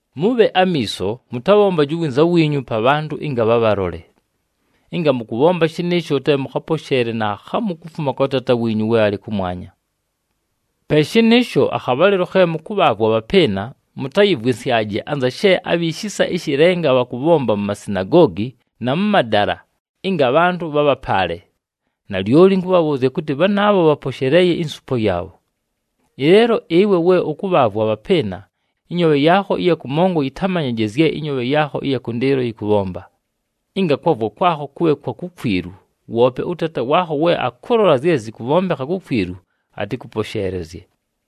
“Mʉbhe amiiso, mʉtabhombaje uwinza wiinyu pa bhantʉ ɨnga bhabhalole. Ɨnga mʉkʉbhomba shɨnɨɨsho, te mʉkhaposheele naakhamu kufuma kwa Taata wiinyu we alɨ kʉmwanya. Pe shɨnɨɨsho, akhabhalɨlo khe mʉkʉbhaavwa abhapɨɨna, mʉtayɨvwɨnsyaje anza she abhi shisa ɨshɨ lenga bhakʉbhomba mu masinagoogi na mʉ madala ɨnga abhantʉ bhabhapaale. Nalyoli ɨnkʉbhabhʉʉzya kʉtɨ, bhanaabho bhaposheleeye insupo yaabho. Ɨleelo ɨwe we ʉkʉbhaavwa abhapɨɨna, ɨnyoobhe yaakho ɨya kʉmongo yɨtamanyaje zye ɨnyoobhe yaakho ɨya kʉndɨɨlo yɨkʉbhomba, ɨnga kwavwa kwakho kʉbhe kwa kukwilu, woope ʉTaata waakho we akʉlola zye zɨkʉbhombekha kukwilu, atɨkʉposheelezye.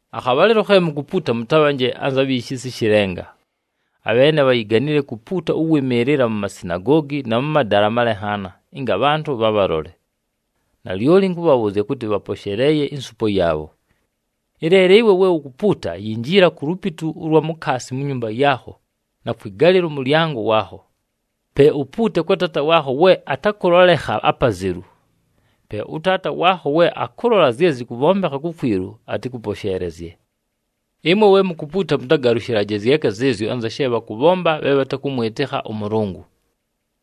“Akhabhalɨlo khe mukupuuta mʉtabhanje anza bhi shisa ɨshɨ lenga. Abheene bhayiganile kupuuta ʉwɨmɨɨlɨla mu masinagoogi na mʉ madala amalenhaana, ɨnga abhantʉ bhabhalole. Nalyoli ɨnkʉbhabhʉʉzya kʉtɨ, bhaposheleeye insupo yaabho. Ɨleelo ɨwe we ukupuuta, yinjila ku lupitu ʉlwa mukaasi mu nyumba yaakho na kwɨgalɨla ʉmʉlyango waakho. Pe upuute kwa Taata waakho we atakʉlolekha apazelu. Pe ʉTaata waakho we akʉlola zye zɨkʉbhombekha kukwilu, atɨkʉposheelezye. “Ɨmwe we mukupuuta, mʉtagalʉshɨlaje zyeka zɨɨzyo anza she bhakʉbhomba bhe bhatakʉmwɨtɨkha ʉMʉlʉngʉ.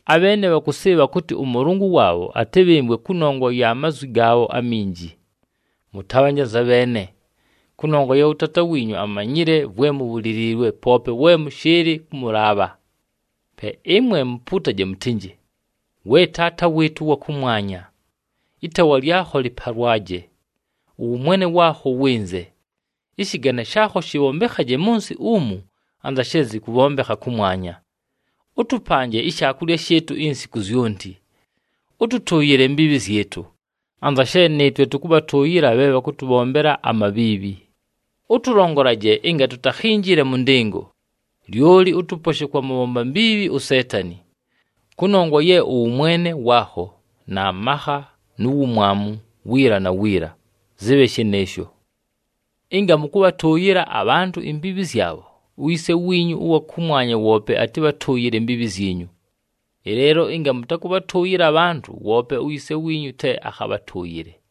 Abheene bhakʉsɨɨbha kʉtɨ ʉMʉlʉngʉ waabho atɨbhɨmvwe kʉnongwa ya mazwi gaabho aminji. Mʉtabhanje anza bheene, kʉnongwa ye ʉTaata wiinyu amanyile vwe mubhuliliilwe poope we mʉshɨɨlɨ kʉmʉlaabha. “Pe ɨmwe mupuutaje mʉtɨnjɨ, ‘We Taata wɨɨtʉ ʉwa kʉmwanya, ɨtaawa lyakho lɨpalwaje. Ʉwʉmwene waakho wɨnze. Ɨshɨgane shaakho shɨbhombekhaje mʉ nsɨ umu, anza she zɨkʉbhombekha kʉmwanya. Ʉtʉpanje ishaakulya shɨɨtʉ insiku zyonti. Ʉtʉtʉʉyɨle imbiibhi zyɨtʉ, anza she nɨɨtwe tʉkʉbhatʉʉyɨla bhe bhakʉtʉbhombela amabhiibhi. Ʉtʉlongolaje ɨnga tutakhinjile mʉ ndɨngo, lyoli ʉtʉposhe kwa mʉbhomba mbiibhi uSeetani.’ [Kʉnongwa ye ʉwʉmwene waakho, na makha, nu wumwamu, wiila na wiila. Zɨbhe shɨnɨɨsho.] “Ɨnga mʉkʉbhatʉʉyɨla abhantʉ imbiibhi zyabho, uYise wiinyu ʉwa kʉmwanya woope atɨbhatʉʉyɨle imbiibhi zyinyu. Ɨleelo ɨnga mʉtakʉbhatʉʉyɨla abhantʉ, woope uYise wiinyu te akhabhatʉʉyɨle.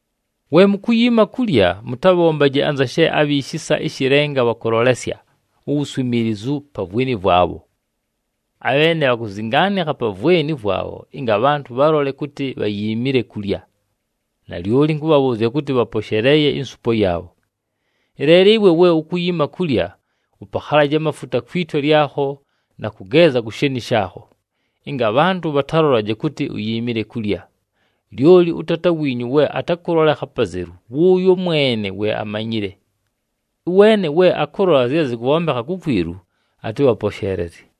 “We mukuyiima kulya, mʉtabhombaje anza she abhi shisa ɨshɨ lenga bhakʉlolesya uwuswimiilizu pa vweni vwabho. Abheene bhakuzingaanikha pa vweni vwabho ɨnga abhantʉ bhabhalole kʉtɨ bhayiimile kulya. Nalyoli ɨnkʉbhabhʉʉzya kʉtɨ, bhaposheleeye insupo yaabho. Ɨleelo ɨwe we ukuyiima kulya, ʉpakhalaje amafuta kwi twe lyakho na kʉgeeza ku sheeni shaakho, ɨnga abhantʉ bhatalolaje kʉtɨ uyiimile kulya, lyoli ʉTaata wiinyu we atakʉlolekha apazelu, wʉʉyo mwene we amanyile. Ʉweene we akʉlola zye zɨkʉbhombekha kukwilu, atɨbhaposheelezye.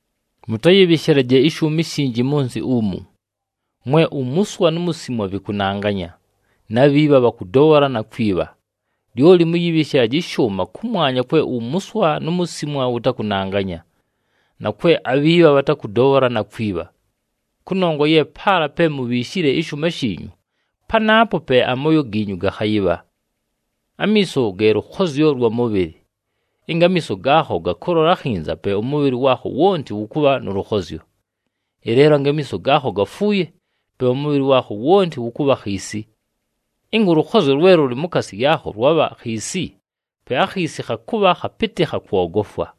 “Mʉtayɨbhɨshɨlaje ɨshʉʉma ishinji mʉ nsɨ umu, mwe umuswa nu musimwa vɨkʉnanganya, na bhiibha bhakʉdobhola na kwibha. Lyoli mʉyɨbhɨshɨlaje ɨshʉʉma kʉmwanya kwe umuswa nu musimwa vɨtakʉnanganya, na kwe abhiibha bhatakʉdobhola, na kwibha. Kʉnongwa ye paala pe mubhiishile ɨshʉʉma shiinyu, panaapo pe amooyo giinyu gakhayɨbha. “Amiiso ge lʉkhozyo lwa mʉbhɨlɨ. Ɨnga amiiso gaakho gakʉlola akhinza, pe ʉmʉbhɨlɨ waakho wonti wʉkʉbha nʉ lʉkhozyo. Ɨleelo ɨnga amiiso gaakho gafuuye, pe ʉmʉbhɨlɨ waakho wonti wʉkʉbha khiisi. Ɨnga ʉlʉkhozyo lwe lʉlɨ mukaasi yaakho lwabha khiisi, pe akhiisi khakʉbha khapɨtɨ khakwogofwa!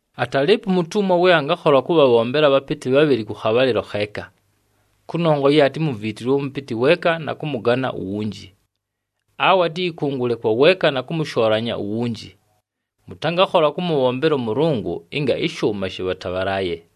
“Atalɨɨpo umutumwa we angakhola kʉbhabhombela abhapɨtɨ bhabhɨlɨ kʉ khabhalɨlo kheeka. Kʉnongwa ye atimuviitilwe ʉmʉpɨtɨ weeka na kʉmʉgana uwunji, awe atɨyɨkʉngʉle kwa weeka na kʉmʉshoolanya uwunji. Mʉtangakhola kʉmʉbhombela ʉMʉlʉngʉ ɨnga ɨshʉʉma shɨbhatabhalaaye!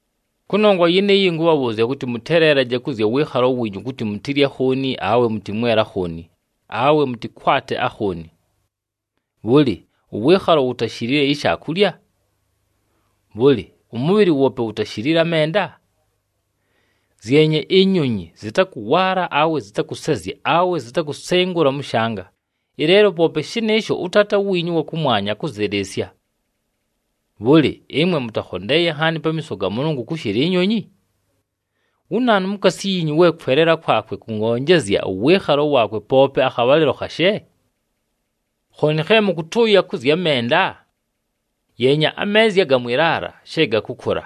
“Kʉnongwa yɨnɨɨyo, ɨnkʉbhabhʉʉzya kʉtɨ, mʉteleelaje kʉ zya wɨɨkhalo wiinyu kʉtɨ mutilye akhooni, awe mʉtɨmwele akhooni, awe mʉtɨkwate akhooni. Bhʉlɨ, ʉwɨɨkhalo wutashilile ishaakulya? Bhʉlɨ, ʉmʉbhɨlɨ woope wutashilile amenda? Zyenye inyonyi, zɨtakʉwaala awe zɨtakʉsezya awe zitakusengula mʉ shanga, ɨleelo poope shɨnɨɨsho, ʉTaata wiinyu ʉwa kʉmwanya, akʉzɨlɨɨsya. Bhʉlɨ, ɨmwe mʉtakhondeeye nhaani pamiiso ga Mʉlʉngʉ kʉshɨla inyonyi? Wu naanu mukaasi yiinyu we kweleela kwakwe kʉngonjezya ʉwɨɨkhalo waakwe poope akhabhalɨlo khashe? “Khooni khe mʉkʉtʉʉya kʉ zya menda? Yeenya ameezya aga mwɨ laala, she gakʉkʉla.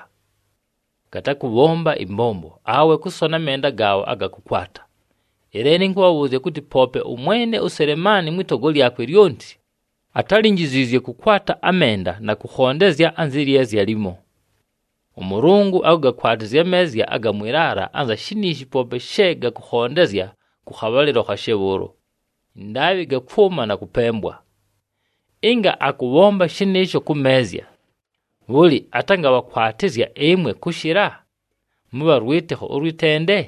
Gatakʉbhomba ɨmbombo, awe kʉsona amenda gaabho aga kʉkwata. Ɨleelo ɨnkʉbhabhʉʉzya kʉtɨ, poope ʉmwene uSelemaani mwɨ togo lyakwe lyonti, atálinjiziizye kʉkwata amenda na kʉkhondezya anzɨ lyezya limo! ɄMʉlʉngʉ akʉgakwatɨzya ameezya aga mwɨ laala anza shiniishi poope she gakʉkhondezya kʉ khabhalɨlo khashe bhʉʉlo, ɨndaabhɨ gakwʉma na kʉpembwa. Ɨnga akʉbhomba shɨnɨɨsho kʉ meezya, bhʉlɨ, atangabhakwatɨzya ɨmwe kʉshɨla, mʉbha lwɨtɨkho ʉlwɨ tende?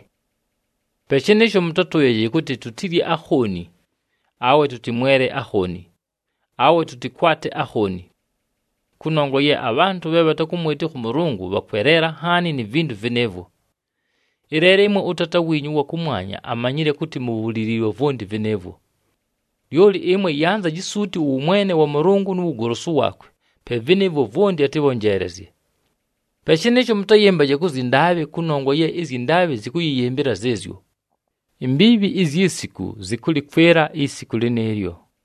“Pe shɨnɨɨsho, mʉtatʉʉyaje kʉtɨ, ‘Tutilye akhooni?’ Awe ‘Tʉtɨmwele akhooni?’ Awe ‘Tʉtɨkwate akhooni?’ Kʉnongwa ye abhantʉ bhe bhatakʉmwɨtɨkha ʉMʉlʉngʉ bhakweleela nhaani ni vintu vɨnɨɨvwo. Ɨleelo ɨmwe ʉTaata wiinyu ʉwa kʉmwanya amanyile kʉtɨ mubhuliliilwe vwonti vɨnɨɨvwo. Lyoli ɨmwe yanzaji suuti ʉwʉmwene wa Mʉlʉngʉ nu wugolosu waakwe, pe vɨnɨɨvwo vwonti atɨbhonjeelezye. “Pe shɨnɨɨsho, mʉtayɨmbaje kʉ zyɨ ndaabhɨ kʉnongwa ye ɨzyɨ ndaabhɨ zɨkʉyɨyɨmbɨla zɨɨzyo. Imbiibhi izyi siku zɨkʉlɨkwɨla isiku lɨnɨɨlyo.”